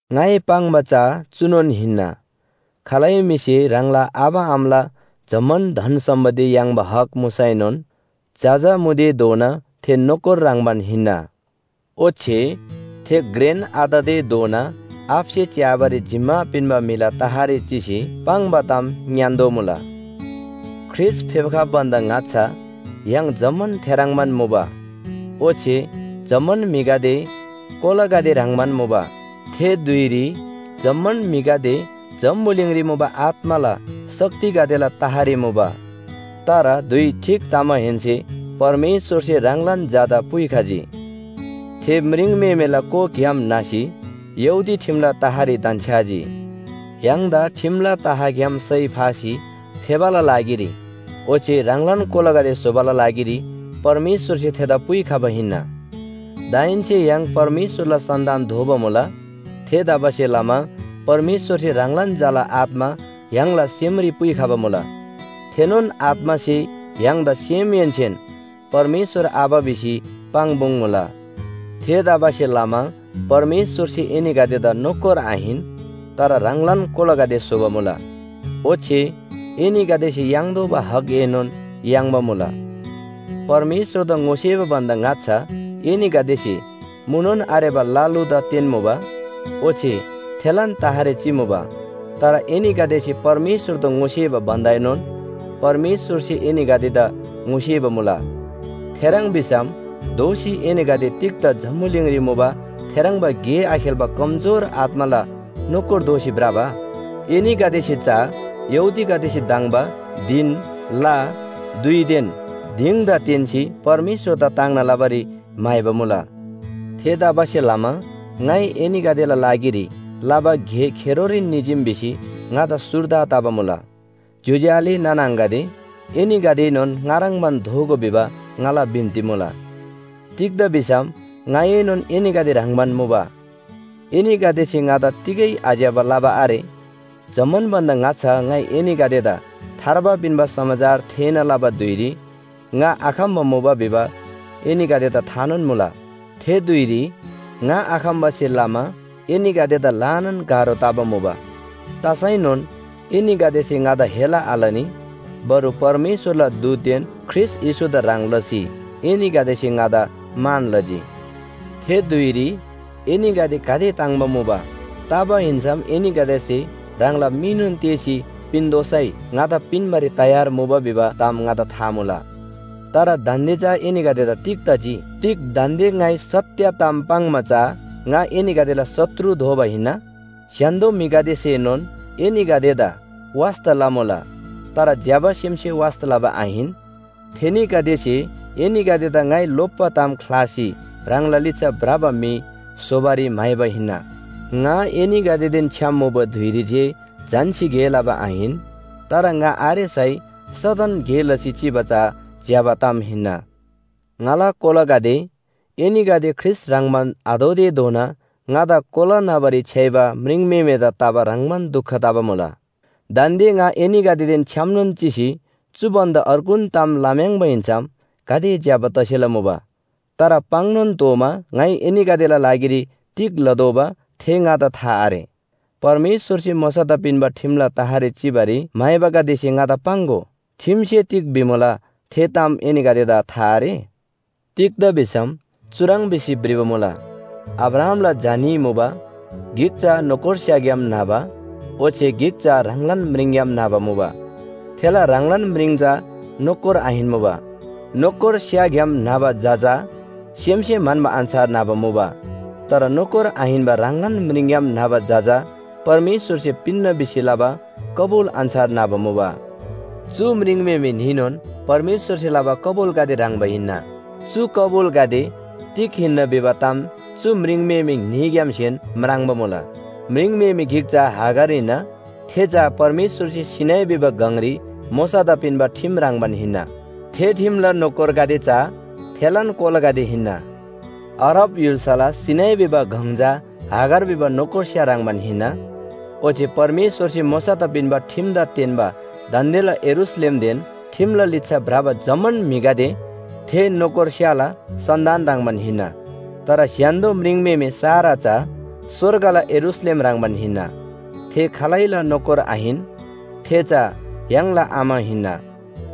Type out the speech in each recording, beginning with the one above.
ङाइ पाङ्बा चा चुनोन हिन्‍ना, खालै म्‍हिसे ह्राङला आबा आमाला जम्‍मान धन सम्‍पत्ति याङ्बा हक मुसैनोन जजा मुतेधोना थे नोकर ह्रङ्‌बान हिन्‍ना। ओच्‍छे थे घ्रेन आततेधोना आबासे च्‍याबारी जिम्‍मा पिन्‍बा म्‍हिला तहरी चिसी पाङ्बा ताम ङ्‌यान्‍तोःमुला। ख्रीष्‍ट फेप्‍खबा भन्‍दा ङाच्‍छा य्‍हाङ जम्‍मान थेह्रङ्बान मुबा। ओच्‍छे जम्‍मान म्‍हिगदे कोलागदे ह्रङ्‌बान मुबा। थे धुइरी जम्‍मान म्‍हिगदे जम्‍बुलिङरी मुबा आत्‍माला शक्तिगदेला तहरी मुबा। तर धुइ ठीक तमाहेन्‍से परमेश्‍वरसे ह्राङलान झादा पुइखजी। थे म्रिङम्‍हेमेला कोखग्‍याम न्‍हसी यहूदी ठिमला तहरी धन्‍छ्‌याजी। य्‍हाङदा ठिमला तहग्‍याम सय फासी फेबाला लागिरी ओच्‍छे ह्राङलान कोलागदे स्‍होबाला लागिरी परमेश्‍वरसे थेदा पुइखबा हिन्‍ना। दाहेन्‍से य्‍हाङ परमेश्‍वरला सन्‍तान दोबा मुला। थेतबासेलमा परमेश्‍वरसे ह्राङलान झाला आत्‍मा य्‍हाङला सेमरी पुइखबा मुला। थेनोन आत्‍मासे य्‍हाङदा सेमहेन्‍सेन “परमेश्‍वर आबा” भिसी पाङ्पुङ्मुला। थेतबासेलमा परमेश्‍वरसे एनीगदेदा नोकर आहिन, तर ह्राङलान कोलागदे स्‍होबा मुला। ओच्‍छे एनीगदेसे याङ्तोःबा हकएनोन याङ्बा मुला। परमेश्‍वरदा ङोसेबा भन्‍दा ङाच्‍छा एनीगदेसे मुनोन आरेबा ल लुदा तेन्‍मुबा। ओच्‍छे थेलान तहरी चिमुबा। तर एनीगदेसे परमेश्‍वरदा ङोसेबा भन्‍दाएनोन परमेश्‍वरसे एनीगदेदा ङोसेबा मुला। थेह्रङ् भिसम दोःसी एनीगदे तिग्‍दा जम्‍बुलिङरी मुबा थेह्रङ्बा गे आखेल्‍बा कम‍जोर आत्‍माला नोकर दोसी भ्रबा? एनीगदेसे चा यहूदीगदेसे धङ्बा धिन, ला, धुइदेन दिङदा तेन्‍सी परमेश्‍वरदा ताङ्ना लबारी म्‍हाइबा मुला। थेतबासेलमा ङाइ एनीगदेला लागिरी लबा गे खेरोरीन निजीम भिसी ङादा सुर्दा तबा मुला। ज्‍योज्‍यो आले नाना आङागदे, एनीगदेएनोन ङा ह्रङ्‌बान दोगो भिबा ङाला बिन्‍ती मुला। तिग्‍दा भिसम ङाएनोन एनीगदे ह्रङ्‌बान मुबा। एनीगदेसे ङादा तिगै आज्‍यबा लबा आरे। जम्‍मान भन्‍दा ङाच्‍छा ङाइ एनीगदेदा थार्बा पिन्‍बा समाचार थेःना लबा धुइरी ङा आखम्‍बा मुबा भिबा एनीगदेदा थानोन मुला। थे धुइरी ङा आखम्‍बासे लमा एनीगदेदा ल्‍हानान गाह्रो तबा मुबा। तसैनोन एनीगदेसे ङादा हेला आलनी। बरु परमेश्‍वरला दूतदेन ख्रीष्‍ट येशूदा ह्रङ् लसी एनीगदेसे ङादा मान लजी। थे धुइरी एनीगदे गाते ताङ्‍बा मुबा, तबा हिन्‍सम एनीगदेसे ह्राङला मीनोन तेःसी पिन्‍तोःसै ङादा पिन्‍बारी तयार मुबा भिबा ताम ङादा था मुला। तर दान्‍दे चा एनीगदेदा तिग तजी? तिग दान्‍दे ङाइ सत्‍य ताम पाङ्‌मा चा ङा एनीगदेला शत्रु दोबा हिन्‍ना? स्‍य्‍हान्‍दो म्‍हिगदेसेनोन एनीगदेदा वास्‍ता लमुला। तर ज्‍यबा सेमसे वास्‍ता लबा आहिन। थेनीगदेसे एनीगदेदा ङाइ लोप्‍बा ताम ख्‍लासी ह्राङला लिच्‍छा भ्रबा म्‍हि स्‍होबारी म्‍हाइबा हिन्‍ना। ङा एनीगदेदेन छ्‌याम मुबा धुइरी जे झन्‍सी गे लबा आहिन, तर ङा आरेसै सदन गे लसी चिबा चा ज्‍यबा ताम हिन्‍ना। ङाला कोलागदे, एनीगदे ख्रीष्‍ट ह्रङ्‌बान आदोतेधोना ङादा कोला न्‍हबारी छ्‌याइबा म्रिङम्‍हेमेदा तबा ह्रङ्‌बान दुख तबा मुला। दान्‍दे ङा एनीगदेदेन छ्‌यामनोन चिसी चु भन्‍दा अर्गुन ताम लम्‍याङ्बा हिन्‍सम गाते ज्‍यबा तसेला मुबा। तर पाङ्‌नोन तोःमा ङाइ एनीगदेला लागिरी तिग लतोःबा थे ङादा था आरे। परमेश्‍वरसे मोशादा पिन्‍बा ठिमला तहरी चिबारी म्‍हाइबागदेसे ङादा पाङ्‍गो, ठिमसे तिग भिमुला थे ताम एनीगदेदा था आरे? तिग्‍दा भिसम चुह्रङ् भिसी भ्रिबा मुला, अब्राहामला झा न्‍ही मुबा, गिक चा नोकरस्‍याग्‍याम न्‍हबा ओच्‍छे गिक चा ह्राङलान म्रिङग्‍याम न्‍हबा मुबा। थेला ह्राङलान म्रिङ चा नोकर आहिन्‍मुबा। नोकरस्‍याग्‍याम न्‍हबा झा चा सेमसे म्‍हन्‍बा अन्‍छार न्‍हबा मुबा। तर नोकर आहिन्‍बा ह्राङलान म्रिङग्‍याम न्‍हबा झा चा परमेश्‍वरसे पिन्‍ना भिसी लबा कबुल अन्‍छार न्‍हबा मुबा। चु म्रिङम्‍हेमे न्‍हीनोन परमेश्‍वरसे लबा कबुलगदे ह्रङ्‌बा हिन्‍ना। चु कबुलगदे तिग हिन्‍ना भिबा ताम चु म्रिङम्‍हेमे न्‍हीग्‍यामसेन म्राङ्बा मुला। म्रिङम्‍हेमे गिक चा हागार हिन्‍ना। थे चा परमेश्‍वरसे सीनै भिबा गङरी मोशादा पिन्‍बा ठिम ह्रङ्‌बान हिन्‍ना। थे ठिमला नोकरगदे चा थेलान कोलागदे हिन्‍ना। अरब य्‍हुल्‍साला सीनै भिबा गङ चा हागार भिबा नोकरस्‍या ह्रङ्‌बान हिन्‍ना। ओच्‍छे परमेश्‍वरसे मोशादा पिन्‍बा ठिमदा तेन्‍बा दान्‍देला यरूशलेमदेन ठिमला लिच्‍छा भ्रबा जम्‍मान म्‍हिगदे थे नोकरस्‍याला सन्‍तान ह्रङ्‌बान हिन्‍ना। तर स्‍य्‍हान्‍दो म्रिङम्‍हेमे सारा चा स्‍वर्गला यरूशलेम ह्रङ्‌बान हिन्‍ना। थे खालैला नोकर आहिन, थे चा य्‍हाङला आमा हिन्‍ना।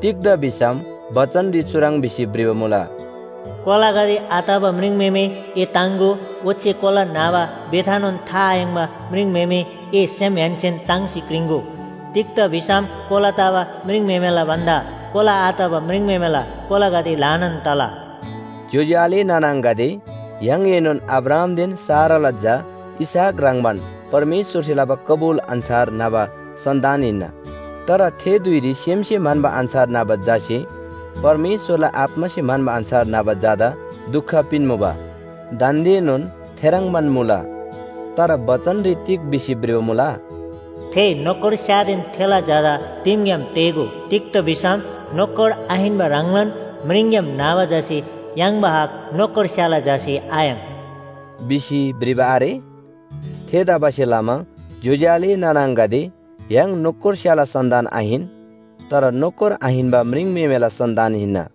तिग्‍दा भिसम बचनरी चुह्रङ् भिसी भ्रिबा मुला, “कोलागदे आतबा म्रिङम्‍हेमे, ए ताङ्‍गो। ओच्‍छे कोला न्‍हबा बेथानोन था आयाङ्बा म्रिङम्‍हेमे, ए सेमहेन्‍सेन ताङ्सी क्रिङ्‍गो। तिग्‍दा भिसम कोला तबा म्रिङम्‍हेमेला भन्‍दा कोला आतबा म्रिङम्‍हेमेला कोलागदे ल्‍हानान तला।” ज्‍योज्‍यो आले नाना आङागदे, य्‍हाङएनोन अब्राहामदेन साराला झा इसहाक ह्रङ्‌बान परमेश्‍वरसे लबा कबुल अन्‍छार न्‍हबा सन्‍तान हिन्‍ना। तर थे धुइरी सेमसे म्‍हन्‍बा अन्‍छार न्‍हबा झासे परमेश्‍वरला आत्‍मासे म्‍हन्‍बा अन्‍छार न्‍हबा झादा दुख पिन्‍मुबा, दान्‍देनोन थेह्रङ्बान मुला। तर बचनरी तिग भिसी भ्रिबा मुला? “थे नोकरस्‍यादेन थेला झादा दिमग्‍याम तेः‍गो। तिग्‍दा भिसम नोकर आहिन्‍बा ह्राङलान म्रिङग्‍याम न्‍हबा झासे याङ्बा हक नोकरस्‍याला झासे आयाङ्” भिसी भ्रिबा आरे? थेतबासेलमा ज्‍योज्‍यो आले नाना आङागदे, य्‍हाङ नोकरस्‍याला सन्‍तान आहिन, तर नोकर आहिन्‍बा म्रिङम्‍हेमेला सन्‍तान हिन्‍ना।